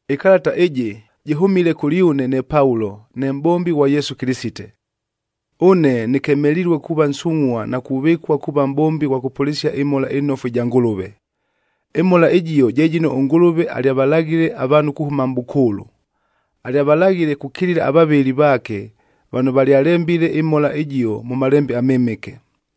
Ɨkalata ɨjɨ jɨhʉmile kʉlyʉne ne Paulo, ne mʼbombi ghwa Yesu Kɨlɨsite. Ʉne nɨkemelilue kuuva nsungʼhua na kuvɨkua kuuva mʼbombi ghwa kʉpʉlɨsia ɨMhola ɨNofu ɨja Ngʉlʉve. ƗMhola ɨjio je jɨno ʉNgʉlʉve alyavalaghile avaanhu kuhʉma mʼbʉkʉʉlʉ. Alyavalaghile kukilila avavɨli vaake vano valyalembile ɨMhola ɨjio mʉ Malembe aMɨmɨke.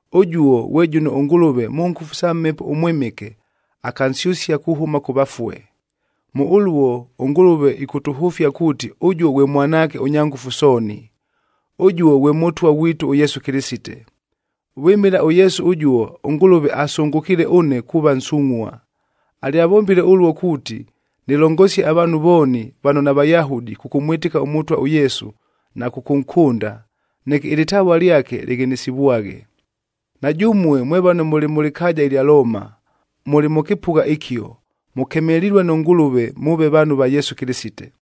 Ʉjuo ghwe jʉno ʉNgʉlʉve mʉ ngʉfu sa Mhepo ʉMwɨmɨke akansyʉsia kuhʉma kʉ vafue. Mʉ ʉluo ʉNgʉlʉve ɨkʉtʉhʉfia kuuti ʉjuo ghwe Mwanaakeb ʉnya ngʉfu sooni. Ʉjuo ghwe Mʉtwa ghwitu ʉYesu Kɨlɨsite. Vwɨmɨla ʉYesu ʉjuo, ʉNgʉlʉve asʉngʉkiile ʉne kuuva nsungʼhua. Alyavombile ʉluo kuuti, nɨlongosie avaanhu vooni vano naVayahudi kʉkʉmwɨtɨka ʉMʉtwa ʉYesu na kʉkʉnkʉnda, neke ɨlɨtavua lyake lɨghinisivwaghe. Na jʉmue mwe vano mʉlɨ mʉ lɨkaaja ɨlya Looma, mʉlɨ mʉ kɨpʉgha ɨkio, mʉkemelilue nʉ Ngʉlʉve mʉʉve vaanhu va Yesu Kɨlɨsite.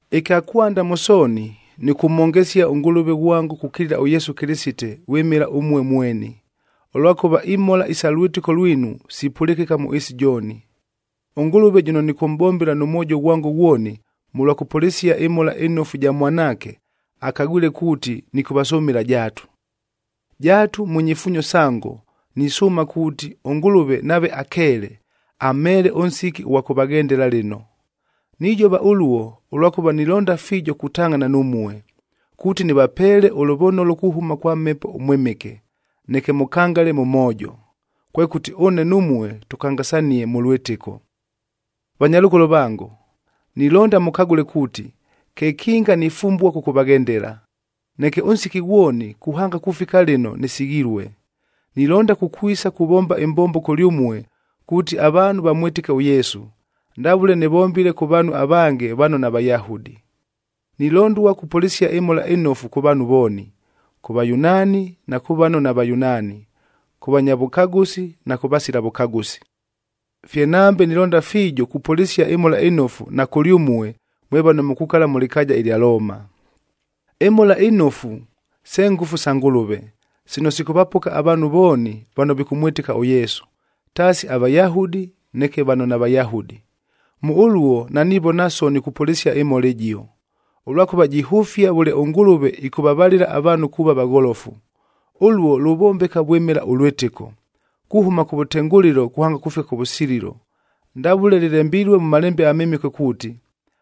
Ɨkya kwanda mʉ sooni, nɨkʉmhongesia ʉNgʉlʉve ghwango kukilila ʉYesu Kɨlɨsite vwɨmɨla ʉmue mweni, ʉlwakʉva imhola isa lwɨtɨko lwinu sipʉlɨkɨka mʉ ɨɨsi jooni. ɄNgʉlʉve jʉno nɨkʉmʼbombela nʉ mwojo ghwango ghwoni mʉlwa kʉpʉlɨsia ɨMhola ɨNofu ɨja Mwanaake, akagwile kuuti nɨkʉvasʉmɨla jaatu. Jaatu mʉ nyifuunyo sango nisʉʉma kuuti ʉNgʉlʉve nave akeele, amheele ʉnsiki ʉghwa kʉvaghendela lɨno. Nijova ʉluo, ʉlwakʉva nilonda fiijo kutangʼhana numue, kuuti nɨvapeele ʉlʉvonolo kuhʉma kwa Mhepo ʉMwɨmɨke, neke mʉkangale mʉ moojo. Kwekʉti ʉne numue, tʉkangasanie mʉ lwɨtɨko. Vanyalʉkolo vango, nilonda mʉkagʉle kuuti, kekinga nifumbua kʉkʉvaghendela, neke ʉnsiki ghwoni kuhanga kufika lɨno nɨsighilue. Nilonda kukwisa kuvomba ɨmbombo kʉlyʉmue kuuti avaanhu vamwɨtɨke ʉYesu, ndavʉle nɨvombile kʉ vaanhu avange vano naVayahudi. Nilondua kupʉlɨsia ɨMhola ɨNofu kʉ vaanhu vooni: kʉ Vayunaani na kʉ vano naVayunaani, kʉ vanya vʉkagʉsi na kʉ vasila vʉkagʉsi. Fye nambe nilonda fiijo kupʉlɨsia ɨMhola ɨNofu na kʉlyʉmue mwe vano mukukala mʉ lɨkaaja ɨlya Looma. ƗMhola ɨNofu se ngʉfu sa Ngʉlʉve, sino sikʉvapoka avaanhu vooni vano vikʉmwɨtɨka ʉYesu, taasi aVayahudi, neke vano naVayahudi. Mʉ ʉluo nanivona soni kupʉlɨsia ɨMhola ɨjio, ʉlwakʉva jihʉfia vʉle ʉNgʉlʉve ɨkʉvavalɨla avaanhu kuuva vagholofu. Ʉluo luvombeka vwɨmɨla ʉlwɨtɨko, kuhʉma kʉvʉtengʉlɨlo kuhanga kufika kʉvʉsililo, ndavʉle lɨlembilue mʉ Malembe aMɨmɨke kuuti,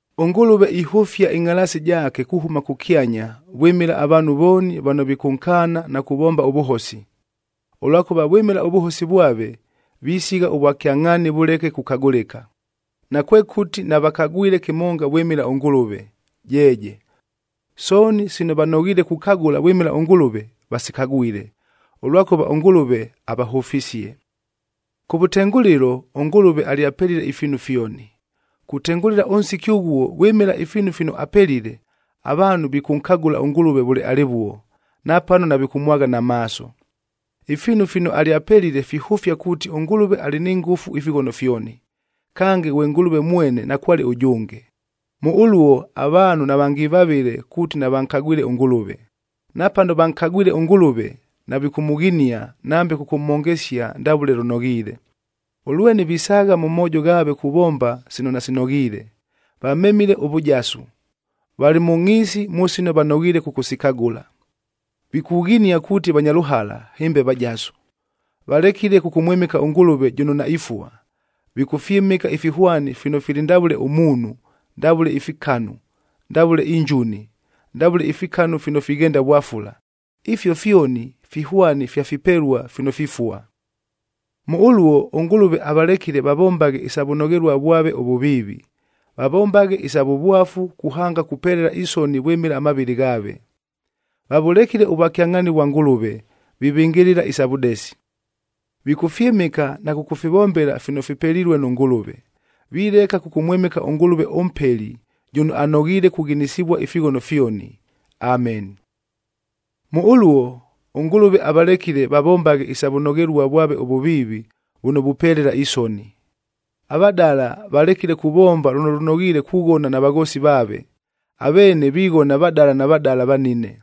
ɄNgʉlʉve ihʉfia ɨngʼhalaasi jaake kuhʉma kʉkyanya vwɨmɨla avaanhu vooni vano vikʉnkaana na kuvomba ʉvʉhosi, ʉlwakʉva vwɨmɨla ʉvʉhosi vwave, visigha ʉvwakyangʼhaani vʉleke kukagʉlɨka. Nakwekʉti navakagwile kɨmonga vwɨmɨla ʉNgʉlʉve, jeeje. Sooni sino vanoghiile kukagʉla vwɨmɨla ʉNgʉlʉve vasikagwile, ʉlwakʉva ʉNgʉlʉve avahʉfisie. Kʉvʉtengʉlɨlo ʉNgʉlʉve alyapelile ifiinu fyoni. Kutengʉlɨla ʉnsiki ʉghuo vwɨmɨla ifiinu fino apelile, avaanhu vikʉnkagʉla ʉNgʉlʉve vʉle alɨvuo, napano navikʉmwagha na maaso. Ifiinu fino alyapelile fihʉfia kuuti ʉNgʉlʉve alɨ ni ngʉfu ifighono fyoni, kange ghwe Ngʉlʉve mwene nakwale ʉjʉnge. Mʉ ʉluo avaanhu navangivavɨle kuuti navankagwile ʉNgʉlʉve. Napano vankagwile ʉNgʉlʉve, navikʉmʉghinia nambe kʉkʉmhongesia ndavʉle lʉnoghiile, ʉlwene visaagha mʉ moojo ghaave kuvomba sino nasinoghiile, vamemile ʉvʉjasu, valɨ mʉ ngʼhiisi mʉ sino vanoghiile kʉkʉsikagʉla. Vikughinia kuuti vanya lʉhala, hɨmbe vajasu. Valekile kʉkʉmwɨmɨka ʉNgʉlʉve jʉno naifua, vikʉfyɨmɨka ifihwani fino fili ndavʉle ʉmuunhu, ndavʉle ifikanu, ndavʉle injuni, ndavʉle ifikanu fino fighenda vwafula. Ifio fyoni fihwani fya fipelua fino fifua. Mʉ ʉluo ʉNgʉlʉve avalekile vavombaghe isa vʉnoghelua vwave ʉvʉviivi, vavombaghe isa vʉvwafu kuhanga kupelela isoni vwɨmɨla amavɨlɨ ghaave. Vavʉlekile ʉvwakyangʼhaani vwa Ngʉlʉve, vivɨngɨlɨla isa vʉdesi. Vikʉfyɨmɨka na kʉkʉfivombela fino fipelilue nʉ Ngʉlʉve, vileka kʉkʉmwɨmɨka ʉNgʉlʉve ʉMpeli jʉno anoghiile kughinisivua ifighono fyoni! Ameni. Mʉ ʉluo, ʉNgʉlʉve avalekile vavombaghe isa vʉnoghelua vwave ʉvʉviivi vʉno vupelela isoni. Avadala valekile kuvomba lʉno lʉnoghiile kughona na vaghoosi vaave, aveene vighona vadala na vadala vanine.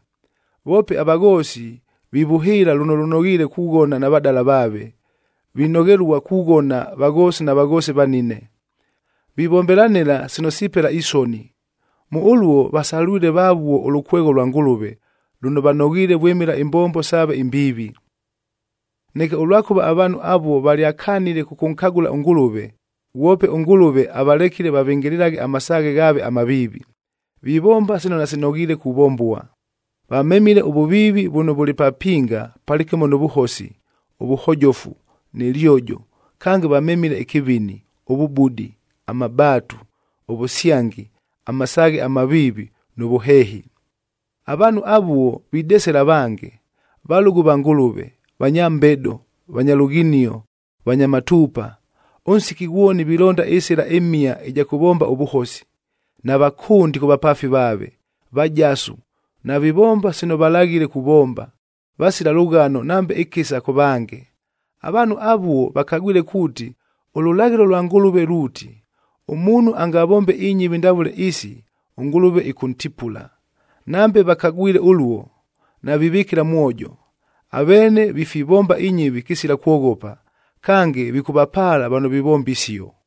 Voope avaghoosi vivʉhɨɨla lʉno lʉnoghiile kughona na vadala vaave, vinoghelua kughona vaghoosi na vaghoosi vanine, vivombelanɨla sino sipela isoni. Mʉ ʉluo vasalwile vavuo ʉlʉkwegho lwa Ngʉlʉve lʉno vanoghiile vwɨmɨla imbombo saave imbiivi. Neke ʉlwakʉva avaanhu avuo valyakanile kʉkʉnkagʉla ʉNgʉlʉve, ghwope ʉNgʉlʉve avalekile vavɨngɨlɨlaghe amasaaghe ghaave amaviivi. Vivomba sino nasinoghiile kuvombua. Vamemile ʉvʉviivi vʉno vʉlɨ papinga palɨkɨmo nʉ vʉhosi, ʉvʉhojofu nɨ lyojo. Kange vamemile ɨkɨvini, ʉvʉbudi, amabaatu, ʉvʉsyangi, amasaaghe amaviivi nʉ vʉheehi. Avaanhu avuo videsela avange, valʉgʉ va Ngʉlʉve, vanya mbedo, vanya lughinio, vanya matuupa, ʉnsiki ghwoni vilonda ɨsɨla ɨmhia ɨja kʉvomba ʉvʉhosi, navakʉndi kʉ vapaafi vaave, vajasu, navivomba sino valaghile kuvomba, vasila lʉghano nambe ɨkɨsa kʉ vange. Avaanhu avuo vakagwile kuuti ʉlʉlaghɨlo lwa Ngʉlʉve luuti, ʉmuunhu angavombe inyɨvi ndavʉle isi, ʉNgʉlʉve ɨkʉntipula. Nambe vakagwile ʉluo, navivɨkɨla mwojo! Aveene vifivomba inyɨvi kɨsila kwoghopa, kange vikʉvapaala vano vivomba isio.